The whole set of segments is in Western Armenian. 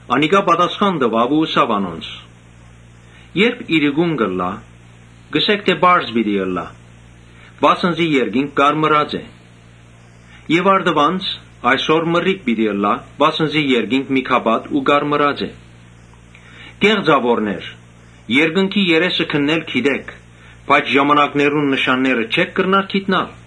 Անիկա պատասխան տուաւ ու ըսաւ անոնց. «Երբ իրիկուն ըլլայ, կ’ըսէք թէ ‘Պարզ պիտի ըլլայ, վասն զի երկինքը կարմրած է’։ Եւ առտուն՝ ‘Այսօր մրրիկ պիտի ըլլայ, վասն զի երկինքը միգապատ ու կարմրած է’։ Կե՛ղծաւորներ, երկնքի երեսը քննել գիտէք, բայց ժամանկներուն նշանները չէ՞ք կրնար գիտնալ։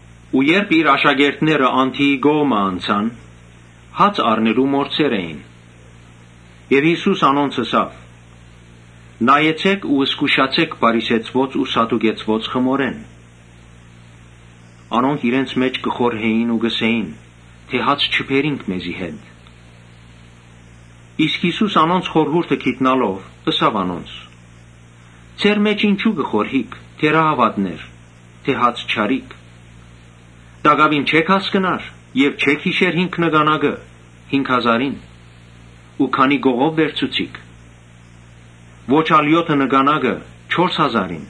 Երբ իր աշակերտները անդիի կողմը անցան, հաց առնել մոռցեր էին։ Յիսուս անոնց ըսաւ. «Նայեցէք ու զգուշացէք փարիսեցիներու ու սադուկեցիներու խմորէն»։ Անոնք իրենց մէջ կը խորհէին ու կ’ըսէին. «Հաց չբերինք մեզի հետ»։ Իսկ Յիսուս անոնց խորհուրդը գիտնալով՝ ըսաւ անոնց. «Ձեր մէջ ինչո՞ւ կը խորհիք, թե՛րահաւատներ, թէ հաց չառիք։ Տակաւին չէ՞ք հասկնար եւ չէ՞ք յիշեր հինգ նկանակը՝ հինգ հազարին, ու քանի՛ կողով վերցուցիք. Ոչ ալ եօթը նկանա՞կը՝ չորս հազարին,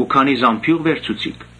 ու քանի՛ զամբիւղ վերցուցիք։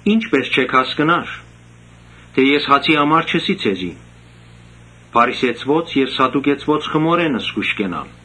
Ի՞նչպէս չէք հասկնար թէ ես հացի համար չըսի ձեզի՝ փարիսեցիներու եւ սադուկեցիներու խմորէն զգոյշ կենալ»։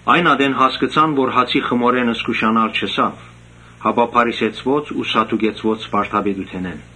Այն ատեն հասկցան թէ հացի խմորէն զգուշանալ չըսաւ, հապա փարիսեցիներու ու սադուկեցիներու վարդապետութենէն։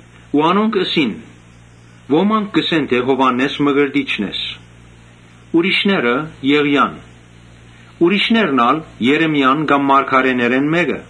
Անոնք ըսին. «Ոմանք կ’ըսեն թէ Յովհաննէս Մկրտիչն ես, ուրիշներ՝ Եղիան, ուրիշներ ալ՝ Երեմիան կամ մարգարէներէն մէկը»։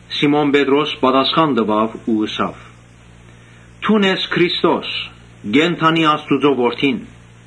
Սիմոն Պետրոս պատասխան տուաւ ու ըսաւ. «Դուն ես Քրիստոսը, կենդանի Աստուծոյ Որդին»։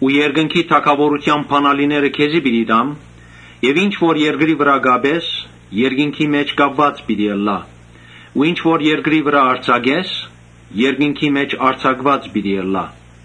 Երկնքի թագաւորութեան բանալիները քեզի պիտի տամ եւ ինչ որ երկրի վրայ կապես, երկնքի մէջ կապուած պիտի ըլլայ ու ինչ որ երկրի վրայ արձակես, երկնքի մէջ արձակուած պիտի ըլլայ»։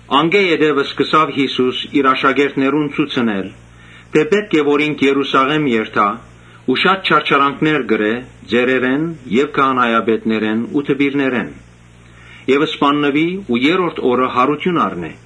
Անկէ յետոյ Յիսուս իր աշակերտներուն ցուցուց թէ՝ պէտք է որ ինք Երուսաղէմ երթայ ու շատ չարչարանքներ կրէ ծերերէն եւ քահանայապետներէն ու դպիրներէն եւ սպաննուի ու երրորդ օրը յարութիւն առնէ։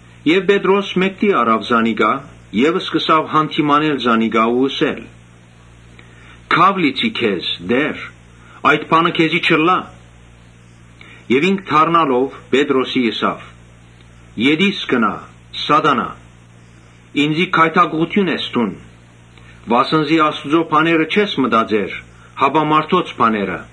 Պետրոս մէկդի առաւ զանիկա եւ սկսաւ յանդիմանել զանիկա ու ըսել. «Քաւ լիցի, Տէ՛ր, այդ բանը քեզի չըլլայ»։ Ինք դառնալով՝ Պետրոսին ըսաւ. «Ետիս գնա՛, Սա՛տանայ, ինծի գայթակղութիւն ես դուն. վասն զի Աստուծոյ բաները չես մտածեր, հապա մարդոց բաները»։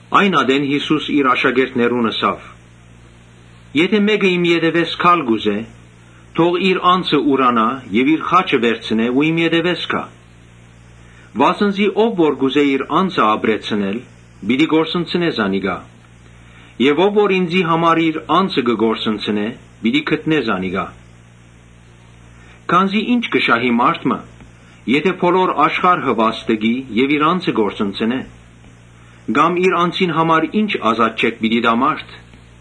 Այն ատեն Յիսուս իր աշակերտներուն ըսաւ. «Եթէ մէկը իմ ետեւէս գալ կ’ուզէ, թող իր անձը ուրանայ եւ իր խաչը վերցնէ ու իմ ետեւէս գայ։ Վասն զի ով որ կ’ուզէ իր անձը ապրեցնել, պիտի կորսնցնէ զանիկա եւ ով որ ինծի համար իր անձը կը կորսնցնէ, պիտի գտնէ զանիկա, Քանզի ի՞նչ կը շահի մարդ եթէ բոլոր աշխարհը վաստկի եւ իր անձը կորսնցնէ, կամ իր անձին համար ի՞նչ ազատչէք պիտի տայ մարդ։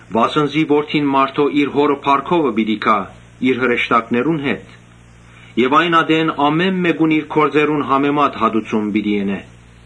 Վասն զի Որդին մարդոյ իր Հօրը փառքովը պիտի գայ իր հրեշտակներուն հետ եւ այն ատեն ամէն մէկուն իր գործերուն համեմատ հատուցում պիտի ընէ։